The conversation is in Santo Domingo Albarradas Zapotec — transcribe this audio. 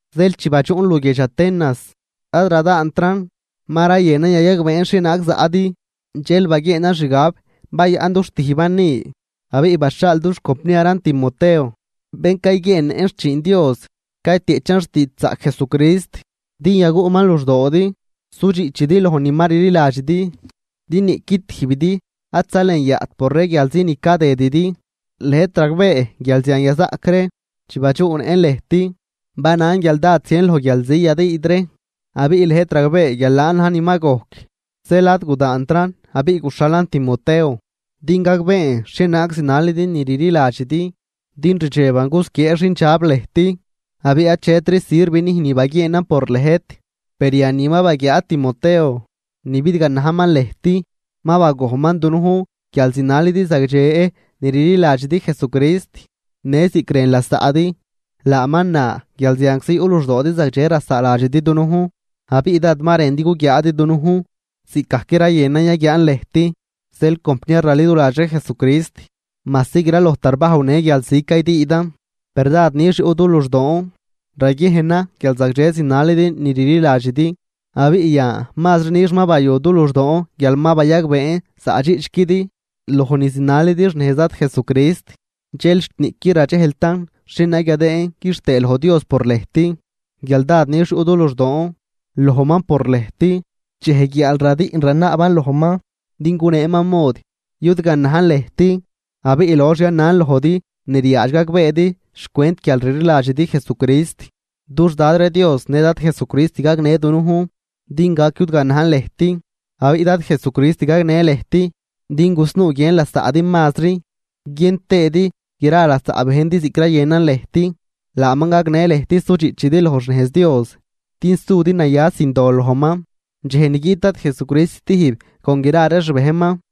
Zeel chi badxuꞌn luguiedx Atenas, ad radaantran, ma rayënan yayagbeen xhienaag zaꞌdi, dxel baguieenan xgab bayaꞌn du xtijban ni. Abiꞌ baxhaal dux compniaran Timoteo, bén cayguieennëꞌn xchiin Dios caytieꞌchan xtiidxzaꞌc Jesucrist, din yaguꞌman luxdoodi sudxiꞌchidi loj ni ma rliladxidi, din niꞌqui tijbidi ad zalenyaꞌt por ree guialzi ni cadëdidi, lëjt ragbee guial zian yazaꞌc ree. Chi badxuꞌnëꞌn lëjt, banan guial dád zien loj guialzi yadüüd ree, abiꞌ lëjt ragbee guial laan na̱j ni ma gojc. Zeel ad gudaantran, abiꞌ guxhalan Timoteo din gagbeen xhienaag zinalidi ni rliladxidi, din rdxeban gusquiee xindxab lëjt, abiꞌ achetri sirv nüjn ni baguieenan por lëjt. Per yan ni ma baguiaad Timoteo ni bidganajman lëjt, ma bagojnman dunujn guial zinalidi zagdxe ni rliladxidi Jesucrist në ziꞌc rën lasaꞌdi. Laaman na guial zianczi yuꞌ luxdoodi zagdxe rasaaladxidi dunujn, abiꞌ dád ma rëndi guguiaadi dunujn, ziꞌcgajc rayënan yaguiaan lëjt. Zeel, compniar raliduladx ree Jesucrist, majsi graloj tarbajw në guialzi caydüüdan, per dád nix yuꞌ du luxdoon raguiejnan guial zagdxe zinalidi ni rliladxidi. Abiꞌ yan mazri nix ma bayu du luxdoon guial ma bayagbeen zaꞌdxiꞌchquidi loj ni zinalidi xnejz Dad Jesucrist. Dxel xt niꞌquid radxejltan xhienaag yadëën quixtëë loj Dios por lëjt, guial dád nix yuꞌ du luxdoon lojman por lëjt. Dxej guiaal radiꞌn ranaaban lojman din guneeman mod yudganajn lëjt, abiꞌ lox yanan lojdi ni ryaadx gagbeedi xcwent guial rliladxidi Jesucrist. Dux Dad ree Dios në Dad Jesucrist gagnë dunujn din gac yudganajn lëjt. Abiꞌ Dad Jesucrist gagnë lëjt din gusnuu guiën lasaꞌdi mazri, guiën tëëdi gra lasaꞌ bejndi ziꞌc rayënan lëjt. Laaman gagnë lëjt sudxiꞌchidi loj xnejz Dios din sudi naya sin dol lojman, dxej ni guiꞌt Dad Jesucrist stijb con gra ree xbejnman.